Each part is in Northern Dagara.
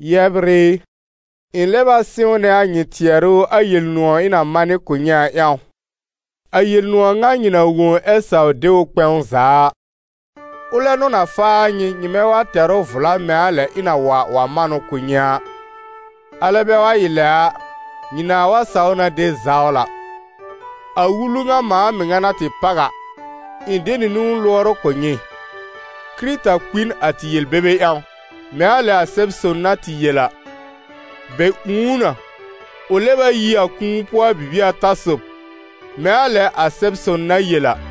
Yɛbr ɩ, ɩ̃ lɛb a sɩ̃wnɛ a nyɩ tɩɛrʋ a Yel-nʋ̃ɔ̀ ɩ̃ na manɩ kʋ̀ nyɩ a ƴãw, a Yel-nʋ̃ɔ̀ ŋa nyɩ na wõ ɛ saw de ʋ kpɛ̃w za a. Ʋlɛ n'ʋ na faa nyɩ, nyɩmɛ wa tɛr ʋ vla mɛ̃ a lɛ ɩ̃ na wa wa man ʋ kʋ̀ nyɩ a; alɛ bɛ wa ɩ lɛ a, nyɩ nãà wa saw na de zawla. A wulu ŋa mãa mɩŋa na tɩ páw a, ɩ̃ de nɩ niwn lʋɔr ʋ kʋ̀ nyɩ: Kɩrɩta kpi n a tɩ yel-bebe ƴãw, mɛ̃ a lɛ a Sɛb-son na tɩ yel a. Bɛ ũù ʋ na, ʋ lɛb a yi a kũu pʋɔ a bibie ata sob, mɛ̃ a lɛ a Sɛb-son na yel a.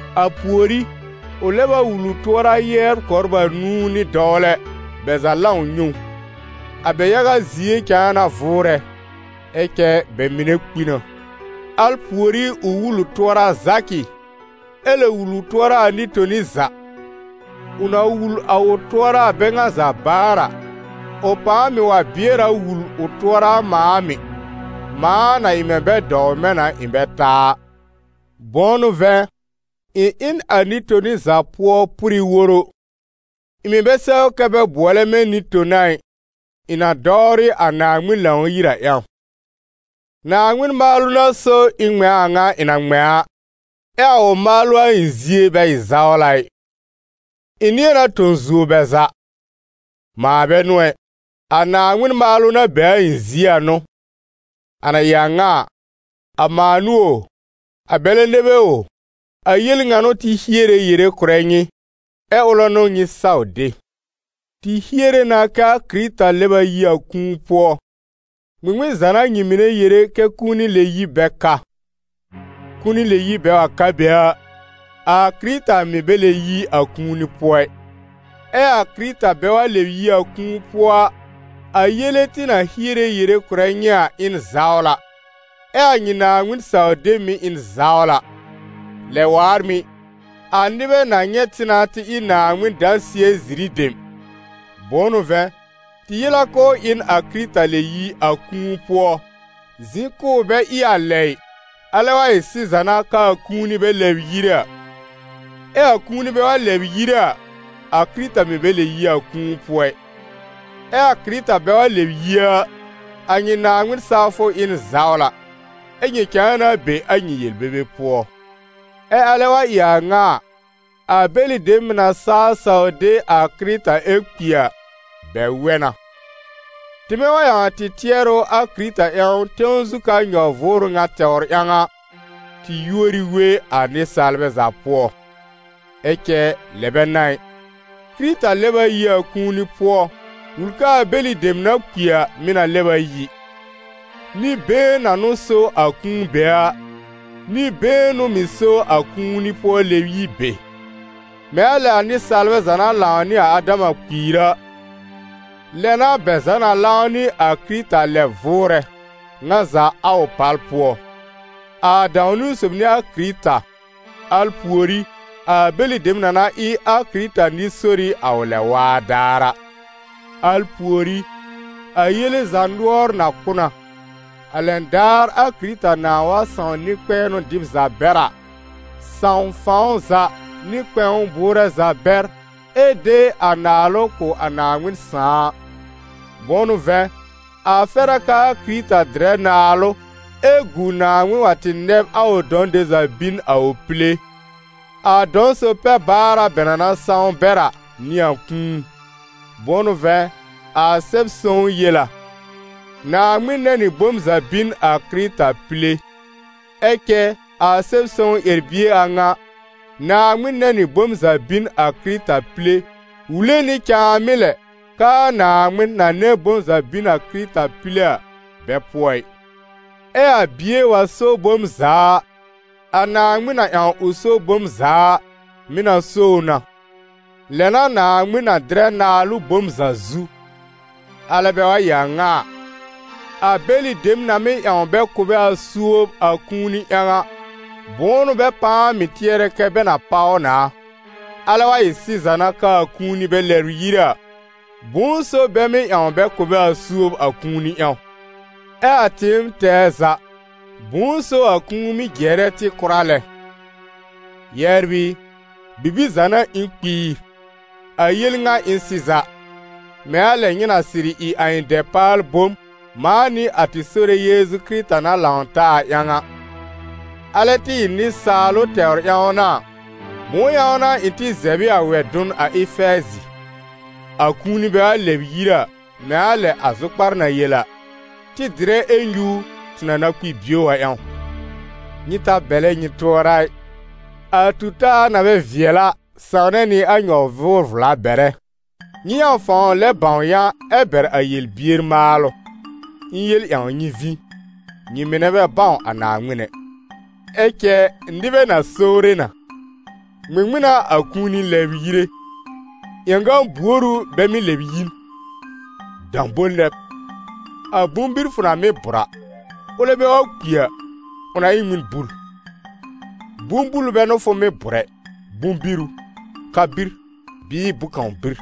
A pùorí, ʋ lɛb a wul ʋ tʋɔra yɛbr kɔbr anũu nɩ dɔwlɛ, bɛ za lãw nyɛ̃ ʋ. A bɛ yaga zie cãa na vʋʋrɛ, ɛ cɛ bɛ mɩnɛ kpi na. Al pùorí ʋ wul ʋ tʋɔra Zakɩ, ɛ lɛ wul ʋ tʋɔra a nɩ-toni za. Ʋ na wul a ʋ tʋɔra a bɛ ŋa za baar a, ʋ pãa mɩ̀ wa bɩɛr a wul ʋ tʋɔra a mãa mɩ̀, mãa na ɩ mɛ̃ bɛ dɔw mɛ̃ na ɩ̃ bɛ ta a. Bʋ̃ʋ n'ʋ vɛ̃, ɩ̃ ɩ n a nɩ-toni za pʋɔ pʋrɩ woro, ɩ̃ mɩ̀ bɛ sɛw kɛ́ bɛ bʋɔlɛ mɛ̃ nɩ-tona ɩ, ɩ̃ na dɔwrɩ a Naaŋmɩn Lãw-yir a ƴãw. Naaŋmɩn maalʋ n'a so ɩ̃ ŋmɛ̃ a a ŋa ɩ̃ na ŋmɛ̃ a, ɛ a ʋ maalʋ a ɩ̃ zie bɛ ɩ zawla ɩ. Ɩ̃ nɩ̃ɛ na tõ zuo bɛ za: mãa bɛ n'ʋ ɛ, a Naaŋmɩn maalʋ na be a ɩ̃ zie a n'ʋ. A na ɩ a ŋa a, a mãa n'ʋ o, a bɛlɛ nɛ bɛ o, a yel ŋa n'ʋ tɩ hiere yere kʋ̀rɛ nyɩ, ɛ́ ʋlɛ n'ʋ nyɩ saw de. Tɩ hiere na kɛ a Kɩrɩta lɛb a yi a kũu pʋɔ, ŋmɩŋmɩn za n'a nyɩ mɩnɛ yere kɛ kũuni lɛ-yib bɛ ka? Kũuni lɛ-yib bɛ wa ka be a, a Kɩrɩta mɩ̀ bɛ lɛb yi a kũuni pʋɔ ɩ; ɛ a Kɩrɩta bɛ wa lɛb yi a kũu pʋɔ a, a yele tɩ na hiere yere kʋ̀rɛ nyɩ a, ɩ n zawla, ɛ a nyɩ Naaŋmɩn-saw-deb mɩ̀ ɩ n zawla. Lɛ waar mɩ̀, a nɩbɛ na nyɛ̃ tɩ na tɩ ɩ Naaŋmɩn dãsɩɛ-ziri dem, bʋ̃ʋ n'ʋ vɛ̃, tɩ yel a k'ʋʋ ɩ n a Kɩrɩta lɛb yi a kũu pʋɔ, zɩ̃ k'ʋʋ bɛ ɩ a lɛ ɩ, alɛ wa ɩ sɩza n'a k'aa kũuni bɛ lɛbr yire a. Ɛ a kũuni bɛ wa lɛbr yire a, a Kɩrɩta mɩ̀ bɛ lɛb yi a kũu pʋɔ ɩ. Ɛ a Kɩrɩta bɛ wa lɛb yi a, a nyɩ Naaŋmɩn sawfʋ ɩ n zawla, ɛ́ nyɩ cãa na be a nyɩ yel-bebe pʋɔ. Ɛ alɛ wa ɩ a ŋa a, a bɛlɩ dem mɩ́ na saa saw de a Kɩrɩta ɛ kpi a, bɛ wɛ na. Tɩmɛ wa ƴãw a tɩ tɩɛrʋ a Kɩrɩta ƴãw tẽw zu ka nyɔ-vʋʋrʋ ŋa tɛwr ƴãw a, tɩ yúor ɩ we a nɩsaalbɛ za pʋɔ. Ɛ cɛ lɛ bɛ n'a ɩ! Kɩrɩta lɛb a yi a kũuni pʋɔ, wul k'aa bɛlɩ dem na kpi a, mɩ̀ na lɛb a yi. Nɩ-been na n'ʋ so a kũu be a, nɩ-been n'ʋ mɩ̀ so a kũuni-pʋɔ-lɛ-yib be. Mɛ̃ a lɛ a nɩsaalbɛ za na lãw nɩ a Adama kpiir a, lɛ n'a bɛ za na lãw nɩ a Kɩrɩta lɛb vʋʋrɛ, ŋa za a ʋ pal pʋɔ: a dãw-niwn sob n'ɩ a Kɩrɩta, al pùorí a bɛlɩ dem na na ɩ a Kɩrɩta nɩ-sori a ʋ lɛb-waa daar a. Al pùorí, a yele za nʋɔr na kʋ̀ na, a lɛn daar a Kɩrɩta nãà wa sãw nɩ-kpɛ̃ɛnʋ dɩb za bɛr a, sãw fãw za nɩ kpɛ̃w bʋʋrɛ za bɛr ɛ de a naalʋ kʋ̀ a Naaŋmɩn Sãà a. Bʋ̃ʋ n'ʋ vɛ̃, a fɛr a k'aa Kɩrɩta dɩrɛ naalʋ ɛ gu Naaŋmɩn wa tɩ nɛb a ʋ dɔ̃ dem za bin a ʋ pile. A dɔ̃-sob-pɛ-baara bɛ na na sãw bɛr a, n'ɩ a kũu. Bʋ̃ʋ n'ʋ vɛ̃, a Sɛb-sõw yel a: «Naaŋmɩn nɛ̃ nɩ bom za bin a Kɩrɩta pile.» Ɛ cɛ a Sɛb-sõw ƴɛr-bie a ŋa: «Naaŋmɩn nɛ̃ nɩ bom za bin a Kɩrɩta pile», wule nɩ cãamɩ́ lɛ k'aa Naaŋmɩn, na nɛ̃ bom za bin a Kɩrɩta pile a, bɛ pʋɔ ɩ. Ɛ a Bie wa so bom za a, a Naaŋmɩn na ƴãw ʋ so bom za a, mɩ̀ na so ʋ na, lɛ n'a Naaŋmɩn na dɩrɛ naalʋ bom za zu. Alɛ bɛ wa ɩ a ŋa a, a bɛlɩ dem na mɩ́ ƴãw bɛ kʋ̀ bɛ a suob a kũuni ƴãw a, bʋ̃ʋ n'ʋ bɛ pãa mɩ̀ tɩɛrɛ kɛ́ bɛ na páw na? Alɛ wa ɩ sɩza n'a k'aa kũuni bɛ lɛbr yire a, bʋ̃ʋ so bɛ mɩ́ ƴãw bɛ kʋ̀ bɛ a suob a kũuni ƴãw? Ɛ a tɩɩm tɛɛ za, bʋ̃ʋ so a kũu mɩ́ jɩɛrɛ tɩ kʋra lɛ. Yɛbr ɩ, bibir za n'a ɩ̃ kpiir, a yel ŋa ɩ n sɩza, mɛ̃ a lɛ nyɩ na sɩrɩ ɩ a ɩ̃ dɛpaal-bom, mãa nɩ a tɩ Sore Yeezu Kɩrɩta na lãw taa a ƴãw a. Alɛ tɩ ɩ nɩsaalʋ tɛwr ƴãw n'a a, bʋ̃ʋ ƴãw n'a ɩ̃ tɩ zɛb ɩ a wɛ-dʋn a Efɛɛzɩ? A kũuni bɛ wa lɛbr yire a, mɛ̃ a lɛ a zʋkpar na yel a: «Tɩ dɩrɛ ɛ nyúur, tɩ na na kpi bio a ƴãw.» Nyɩ ta bɛlɛ nyɩ tʋɔra ɩ: a tu-taa na bɛ vɩɛl a, sãwnɛ nɩ a nyɔ-vʋʋr-vla bɛrɛ. Nyɩ ƴãw fãw lɛb bãw yã ɛ bɛr a yel-bier maalʋ. Ɩ̃ yel ƴãw nyɩ vĩ: nyɩ mɩnɛ bɛ bãw a Naaŋmɩn ɛ. Ɛ cɛ nɩbɛ na sowre na: «Ŋmɩŋmɩn n'a a kũuni lɛbr yire? Ƴãgã-buor ʋ bɛ mɩ́ lɛb yi n?» Dãbol nɛ b! A bʋ̃-bir fʋ na mɩ́ bʋ̀r a, ʋlɛ bɛ wa kpi a, ʋ na ɩ n ŋmɩn bul? Bʋ̃-bul bɛ n'ʋ fʋ mɩ́ bʋ̀r ɛ, bʋ̃-bir ʋ, ka-bir bɩɩ bʋ̃-kãw bir.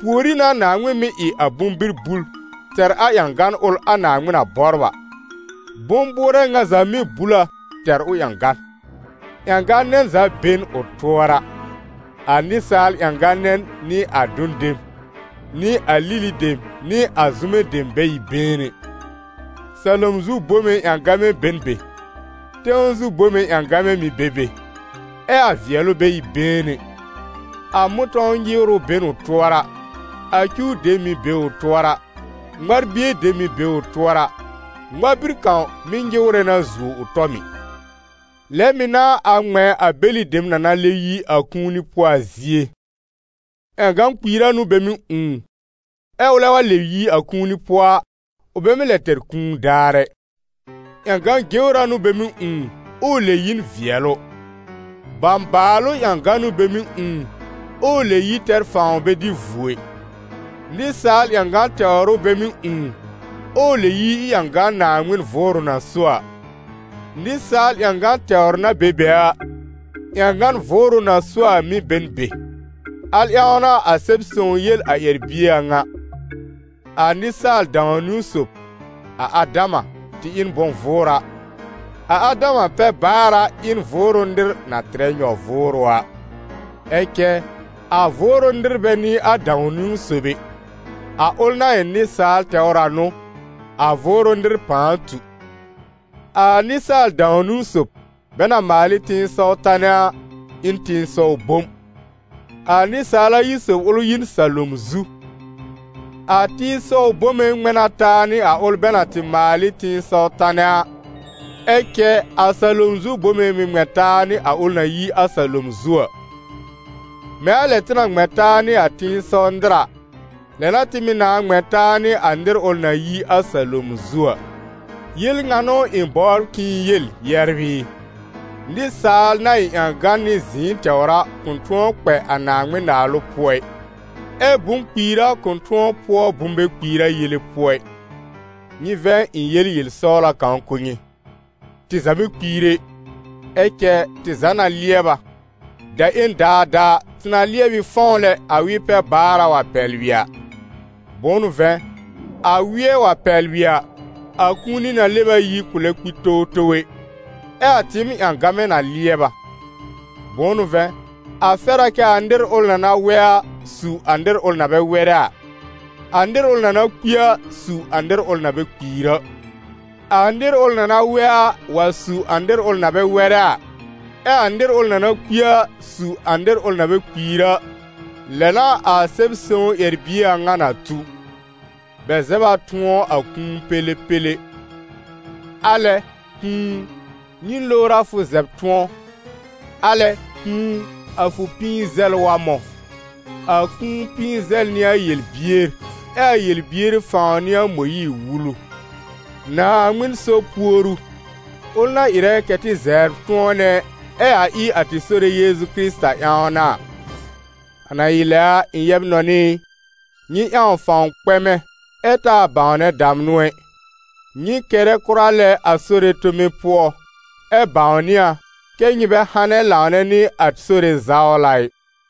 Pùorí n'a Naaŋmɩn mɩ́ ɩ a bʋ̃-bir bul tɛr a ƴãgan ʋl a Naaŋmɩn na bɔbr a, bʋ̃-bʋʋrɛ ŋa za mɩ́ bul a tɛr ʋ ƴãgan. Ƴãgã-nɛn za be n ʋ tʋɔra: a nɩsaal ƴãgã-nɛn nɩ a dʋn dem, nɩ a lili dem nɩ a zʋmɛ dem bɛ ɩ been ɛ. Salom zu bome ƴãgamɛ be n be, tẽw zu bome ƴãgamɛ mɩ̀ be be, ɛ a vɩɛlʋ bɛ ɩ been. A mʋ̃tɔ̃w nyɩwrʋ be n ʋ tʋɔra, a cuw dem mɩ̀ be ʋ tʋɔra, ŋmar-bie dem mɩ̀ be ʋ tʋɔra, ŋmar-bir kãw mɩ́ nyɩwrɛ na zuo ʋ tɔ mɩ̀. Lɛ mɩ̀ n'a a ŋmɛ̃ a bɛlɩ dem na na lɛb yi a kũuni pʋɔ a zie. Ƴãgã-kpiira n'ʋ bɛ mɩ́ ũù, ɛ ʋlɛ wa lɛb yi a kũuni pʋɔ a, ʋ bɛ mɩ́ lɛ tɛr kũu daar ɛ. Ƴãgã-jewra n'ʋ bɛ mɩ́ ũù, ɛ ʋ lɛb yi n vɩɛlʋ. Bãbaalʋ ƴãgan n'ʋ bɛ mɩ́ ũù, ɛ ʋ lɛb yi tɛr fãw bɛ dɩ vuo ɩ. Nɩsaal ƴãgan tɛwr ʋ bɛ mɩ́ ũù, ɛ ʋ lɛb yi ɩ ƴãgan Naaŋmɩn Vʋʋrʋ na so a. Nɩsaal ƴãgan tɛwr na be be a, ƴãgan Vʋʋrʋ na so a mɩ̀ be n be. Al ƴãw n'a a Sɛb-sõw yel a ƴɛr-bie a ŋa: «A nɩsaal-dãw-niwn sob, a Adama, tɩ ɩ n bʋ̃-vʋʋra; a Adama-pɛ-baara, ɩ n Vʋʋrʋ nɩr na tɩrɛ nyɔ-vʋʋrʋ a.» Ɛ cɛ a Vʋʋrʋ nɩr bɛ n'ɩ a dãw-niwn sob ɛ, a ʋl na ɩ nɩsaal tɛwr a n'ʋ, a Vʋʋrʋ nɩr pãa tu. A Nɩsaal dãw-niwn sob, bɛ na maal ɩ tẽsɔw tanɛ a, ɩ n tẽsɔw bom. A nɩsaal ayi sob ʋl yi n salom zu. A tẽsɔw bome ŋmɛ̃ na taa nɩ a ʋl bɛ na tɩ maal ɩ tẽsɔw tanɛ a, ɛ cɛ a salom zu bome mɩ̀ ŋmɛ̃ taa nɩ a ʋl na yi a salom zu a. Mɛ̃ a lɛ tɩ na ŋmɛ̃ taa nɩ a tẽsɔw nɩr a, lɛ n'a tɩ mɩ̀ nãá ŋmɛ̃ taa nɩ a nɩr ʋl na yi a salom zu a. Yel ŋa n'ʋ ɩ̃ bɔbr k'ɩ̃ɩ yel, yɛbr ɩ: nɩsaal na ɩ ƴãgan nɩ zɩ̃ɩ tɛwr a, kʋ̃ tʋ̃ɔ kpɛ a Naaŋmɩn-Naalʋ pʋɔ ɩ, ɛ́ bʋ̃ -kpiira kʋ̃ tʋ̃ɔ pʋɔ bʋ̃-bɛ-kpiira yele pʋɔ ɩ. Nyɩ vɛ̃ ɩ̃ yel yel-sɔwla kãw kʋ̀ nyɩ. Tɩ za bɛ kpiir ɛ, ɛ cɛ tɩ za na lɩɛb a, daƴẽn daadaa, tɩ na lɩɛb ɩ fɔ̃w lɛ a wɩ-pɛ-baara wa pɛblɩ a. Bʋ̃ʋ n'ʋ vɛ̃, a wɩɛ wa pɛblɩ a, a kũuni na lɛb a yi kʋ̃ lɛb kpi towtow ɛ, ɛ a tɩɩm ƴãgamɛ na lɩɛb a. Bʋ̃ʋ n'ʋ vɛ̃, a fɛr a kɛ a nɩr ʋl na na wɛ a, su a nɩr ʋl na bɛ wɛrɛ a; a nɩr ʋl na na kpi a, su a nɩr ʋl na bɛ kpiir a. A nɩr ʋl na na wɛ a, wa su a nɩr ʋl na bɛ wɛrɛ a, ɛ a nɩr ʋl na na kpi a, su a nɩr ʋl na bɛ kpiir a, lɛ n'a a Sɛb-sõw ƴɛr-bie a ŋa na tu: «Bɛ zɛb a tʋ̃ɔ a kũu pẽlẽpẽlẽ. Alɛ kũu u, nyɩn lowr a fʋ zɛb tʋ̃ɔ? Alɛ kũu u, a fʋ pĩi-zɛl wa mɔ̃?» A kũu pĩi-zɛl n'ɩ a yel-bier ɛ a yel-bier fãw n'ɩ a Mõyiir-Wulu. Naaŋmɩn so puoru, ʋl na ɩrɛ kɛ̀ tɩ zɛbr tʋ̃ɔnɛ, ɛ a ɩ a tɩ Sore Yeezu Kɩrɩta ƴãw n'a a. A na ɩ lɛ a, ɩ̃ yɛb-nɔnɩ ɩ, nyɩ ƴãw fãw kpɛmɛ, ɛ taa bãwnɛ damnʋ ɛ. Nyɩ kɛrɛ kʋra lɛ a Sore tome pʋɔ, ɛ bãwnɩ a, kɛ́ nyɩ bɛ hanɛ lãwnɛ nɩ a Sore zawla ɩ.